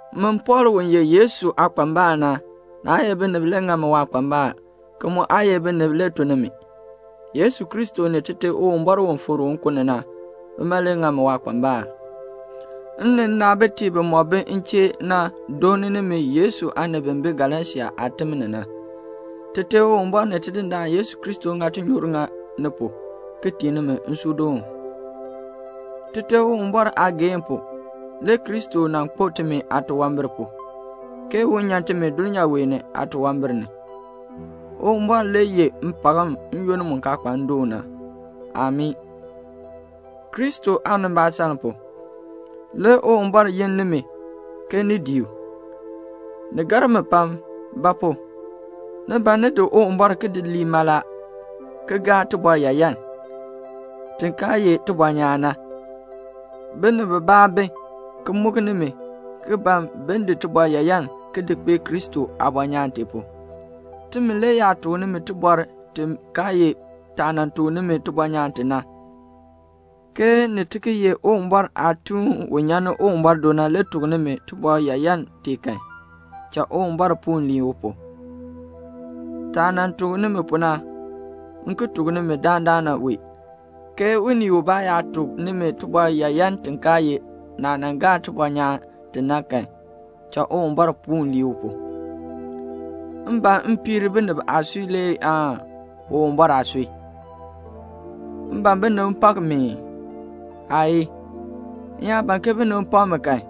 Min Pɔɔl u ye Yesu aakpambal na, naa ye binib le ŋa mi waakpambal, ki mu aa ye binib le tun ni mi. Yesu Kristo ni Tite Uwumbɔr u fikr u nkun ni na, bima le ŋa mi waakpambal. M ni nnaabitiib bimɔk bi m chee na dooni nimi Yesu aanib bi bi Galasia aatim ni na. Tite Uwumbɔr ni Tidindaan Yesu Kristo ŋa tinyoor ŋa ni pu, ki tii nimi nsuudoon. Tite Uwumbɔr aageehn pu, le Kristo nan kpo timi aatunwambir pu, ke un nyan timi dulnyaa wee ni aatunwambir ni. Uwumbɔr le yeh mpakm n-yoonn mu kaa kpa ndoon na. Amii. Kristo aanimbaasaln pu, le Uwumbɔr yin nimi ke ni dii u. Ni gar mi pam; ba pu? ni ban ni di Uwumbɔr ki di lii mala, ki gaa tibɔr yaayan, ti kaa ye tibɔnyaan na. Binib bibaa bi, ki muk nimi, ki ban bin di tibɔr yaayan ki di kpee Kristo aabɔnyaan tee pu. Timi le yaa tuk nimi tibɔr ti kaa ye taah nan tuk nimi tibɔnyaan ti na, ke ni ti ki ye Uwumbɔr aatuun u nyan ni Uwumbɔr do na le tuk nimi tibɔr yaayan tee kan, cha Uwumbɔr puun lii u pu. Taah nan tuk nimi pu na, m ki tuk nimi dandana wee, ke unii ubaa yaa tuk nimi tibɔr yaayan ti kaa ye naah nan gaa tibɔnyaan ti na kan, cha Uwumbɔr puun lii u pu. M ban m piir binib aasui le aan Uwumbɔr aasui? M ban ke binib pak mi ii? Aayii. M yaa ban ke binib pak mi kan,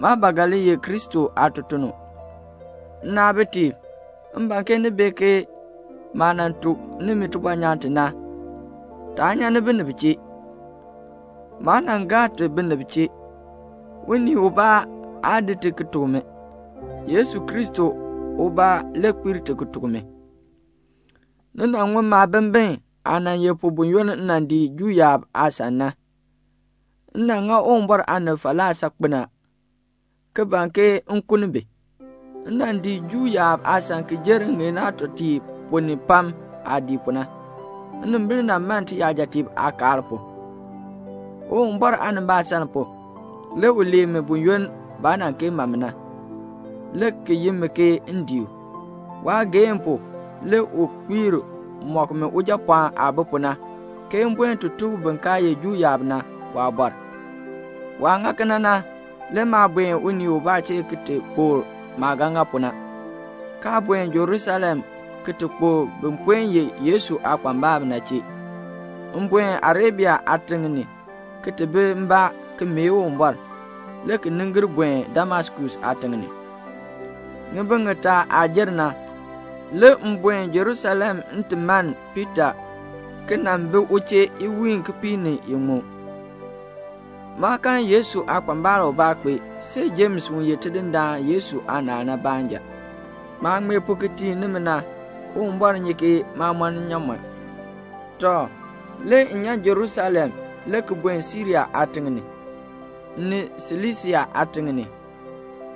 maa ba ga li ye Kristo aatutuln. Nnaabitiib, m ban ke ni bee ke maah nan tuk nimi tibɔnyaan ti na, taa nyan ni binib chee. Maa nan gaa ti binib chee. Unii ubaa aa di ti ki tuk mi. Yesu Kristo ubaa le kpiir ti ki tuk mi. Ni nan ŋun maabimbin aah nan ye pu buyoonn m nan dii Juu yaab aasan na. M nan ŋa Uwumbɔr aanib falaa saakpen a, ki ban ke m kuln bi. M nan dii Juu yaab aasan ki jer ŋŋeen aatɔtiib ponn ni pam aah dii pu na. Nnimbil nan man tiyajatiib aakaal pu. Uwumbɔr aanimbaasaln pu, le u lee mi buyoonn baa nan kee ma mi na, le ki yi mi ke m dii u. Waageehn pu le u kpiir mɔk mi Ujapɔɔn aah bi pu na, ke m buen ti tuk bin kaa ye Juu yaab na waabɔr. Waah ŋa kena na, le maa buen unii ubaa chee ki ti kpokl maah ga ŋa pu na, kaa buen Jerusalem ki ti kpokl bin puen ye Yesu aakpambalb na chee. M buen Arabia aatiŋ ni ki ti bi mbaa ki mee Uwumbɔr, le ki nin gir buen Damaskus aatiŋ ni. Ŋibin ŋitaa aah jer na, le m buen Jerusalem m ti mann Piita ki nan bi u chee iwiin kipiik ni iŋmu. Maa kan Yesu aakpambal ubaa kpee, see Jems u ye Tidindaan Yesu aanaal na baanja. Maah ŋmee pu ki tii nimi na, Uwumbɔr nyi ke maa mɔn nnyaamɔn. Tɔ, le m nyan Jerusalem, le ki buen Siria aatiŋ ni, ni Silisia aatiŋ ni.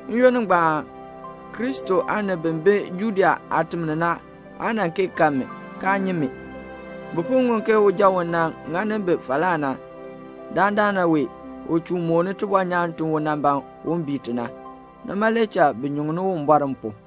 N-yoonn ngbaan Kristo aanib bi bi Judea aatim ni na aa nan kee kan mi, kaa nyi mi. Bi po ŋun ke uja u nan ŋani bi falaa na, dandana wee u chuun mooni tibɔnyaan ti u nan ban un bii ti na. Nima le cha bi nyuŋ Uwumbɔr m pu.